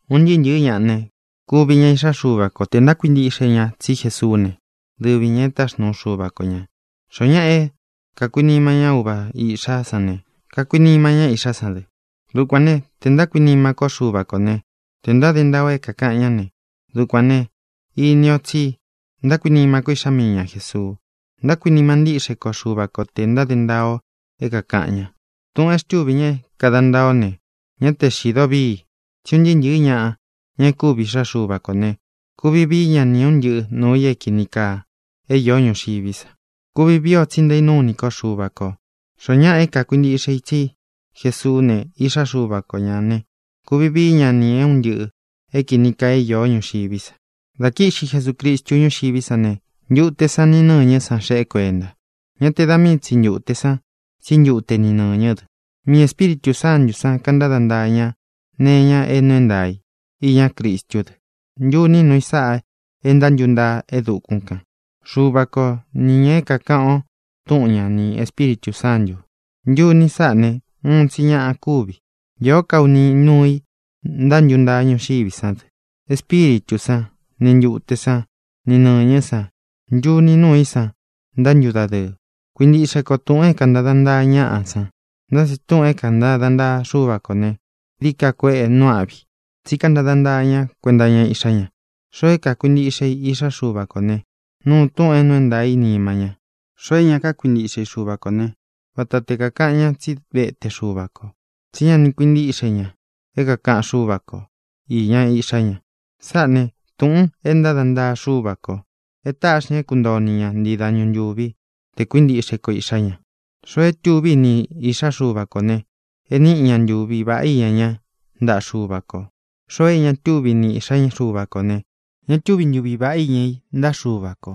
Un ntɨɨ́ ntɨ̄ɨ́ ñaꞌa ne, kuvi ña iꞌxá Xuva ko tē ntákuintiꞌxe ña tsí Jesuú ne, dɨvi ñā é taxnuu Xuva ko ñā. Xoó ñaꞌa é kākuinima ñá uva iꞌxá san ne, kakuinima ñá iꞌxá ña dɨ. Dukuān né, tē ntákuinima kó Xuva kō né, tē ntáde ntaa o é kākaꞌan ñá ne, dukuān ne, ini ó tsi ntákuinima kó iꞌxá mii ña Jēsuu. Ntákuinima ntíꞌxe ko Xuva ko tē ntáde ntaa o é kākaꞌan ña. Tūꞌun e xtúvi ña é kāda ntaa o ne, ñá te xīdo víi. Tsí un ntɨɨ́ ntɨ̄ɨ́ ñaꞌa, ña e kúvi iꞌxá Xuva kō ne, kuvi vií ña nī é un ntɨꞌɨ nuū i é kīni kaa é īó ñuxiví sa. Kuvi vii o, tsi ntaínúu ini ko Xuva kō. Xoó ñaꞌa é kākuintiꞌxe i tsí Jesuú ne, Iꞌxá Xuva ko ñā ne, kuvi vií ña nī é un ntɨꞌɨ̄ é kīni kaa é īó ñuxiví sa. Dā kíꞌxi Jesucristu ñúxiví sa ne, ntute san ni nɨ́ñɨ́ san xeꞌé kuenta. Ñá te da mii tsi ntūte san, tsí ntute ni nɨñɨ́ dɨ. Miī Espíritū Sántū san kantada ntaa ña nee iña é nuu é ntaā i iñá Cristú dɨ. Ntuní nuu i sáꞌa e ntántuntaa e dukún kān: Xuva ko nī ña é kākaꞌan o Túꞌun ña ni Ēspíritū Sántū. Ntuni sáꞌa ne, uun tsi ñaꞌa kuvi. Īó ka uni núu i ntántuntaa ñuxiví sa dɨ: Espíritū sán, ni ntūte sán, ni nɨ̄ñɨ́ san. Ntuni núu i san ntántudadɨɨ. Kuīntiꞌxe ko túꞌūn é kāntada ntaa ñaꞌa san, ntá tsi túꞌūn é kāntada ntaa Xúva kō ne, dií ka kueꞌe nuu áꞌvi i. Tsí kantada ntaa ña kuenta iña Iꞌxá ña. Xoo é kākuintiꞌxe i Iꞌxá Xuva kō ne, nuu túꞌūn é nuu é ntaā í nima ña. Xoo é ña kakuintiꞌxe i Xuva kō ne, vata te kākaꞌan ña tsí vete Xuva ko, tsí ña ni kuintíꞌxe ña é kākaꞌan Xúva ko īña Iꞌxá ña. Sáꞌā ne, túꞌūn é ntada ntaa Xúva kō: é tāꞌxi ña é kuntoo o ni ña ntii dañu ntūví te kuintiꞌxe ko Iꞌxā ña. Xoo e túvi niꞌi i Iꞌxá Xuva kō ne, e níꞌi ña ntuvi vāꞌá iña ña ntaꞌa Xúva kō. Xoo é ña tuvi niꞌi i Iꞌxá Xuva kō ne, ña túvi ntuvi vāꞌá iña i ntaꞌa Xúva kō.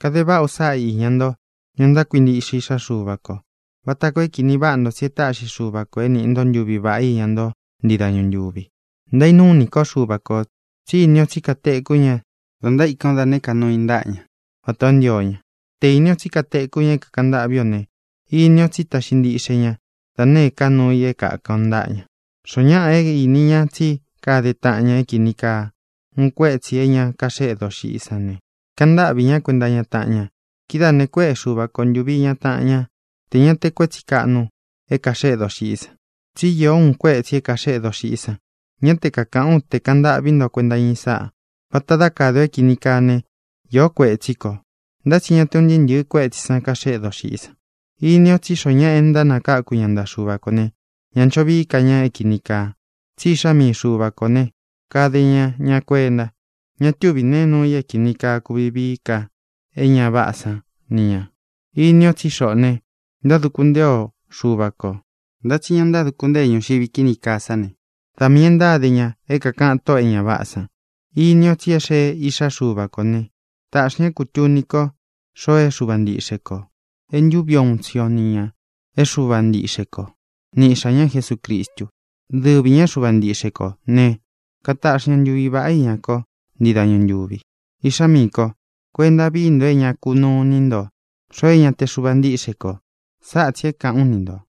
Kade váꞌa u sáꞌa iña nto, ña ntákuintiꞌxe Iꞌxá Xuva kō, vata koo é kīni váꞌa nto tsí e táꞌxi Xuva kō é niꞌi nto ntuvi vaꞌá iña nto ntii dañu ntúvi. Ntaínúu ini ko Xuva kō, tsí ini o tsí katekú ña da ntaíkan o da nēé ka nuu i ntaꞌa ña, vatā o ntío ña. Te īni o tsí katekú ña é kākaꞌan ntâꞌví ō ne, ini o tsí taꞌxi ntíꞌxe ña da nēé ka nuu i é kākan o ntaꞌa ña. Xoó ñaꞌa é īni ña tsí kade taꞌan ña é kīni kaa, uun kuetsi é ña kaxéꞌe doxiꞌí san ne, kaꞌan ntáꞌvī ñá kuenta iña taꞌan ña. Kidáā ne, kuéꞌe Xuva ko ntūvi iña taꞌan ñá, tē ña te kuétsi kāꞌnu é kāxeꞌe doxiꞌí san. Tsí īó uun kuetsi é kāxeꞌe doxiꞌí san. Ñá te kākaꞌán u te kaꞌan ntaꞌví nto kuenta iña i sáꞌa. Vata dá kade o é kini kaa ne, īó kuetsí kō. Ntá tsi ña te un ntɨɨ́ ntɨ̄ɨ kuétsī san kaxéꞌe doxiꞌí san. Ini o tsí xoo ñáꞌa é nakáku ña ntaꞌa Xuva kō ne, ñá ncho vií ka ña é kīni kaa. Tsí Iꞌxá mii Xuva kō ne, kade ña ña kuenta. Ña túvi nēe nuu i é kīni kaa é kūvi vii ka é ña váꞌā san ni ña. Ini o tsí xoꞌō ne, ntáduku ntée o Xuva kō. Ntá tsi ña ntáduku ntée ñuxiví kini kaa sá ne, da miī e ntáde ña é kākaꞌan tóꞌō e ña váꞌā san. Ini o tsi e xée Iꞌxá Xuva kō ne, tāꞌxi ña é kūtuni ko xoo é Xuva ntiꞌxe kō. É ntuvi uun tsi o ni ñā é Xuva ntiꞌxe kō, ni Iꞌxā ñá Jesucristu. Dɨvi ñā é Xuva ntiꞌxe kō né, kataꞌxi ña ntuvi vāꞌá iña ko ntii dañu ntūvi. Iꞌxá miī kó, kuenta vií nto é ña kunuu iní nto xoo é ña te Xuva ntíꞌxe kō. Sáꞌa tsī é kāꞌán u ni ntō.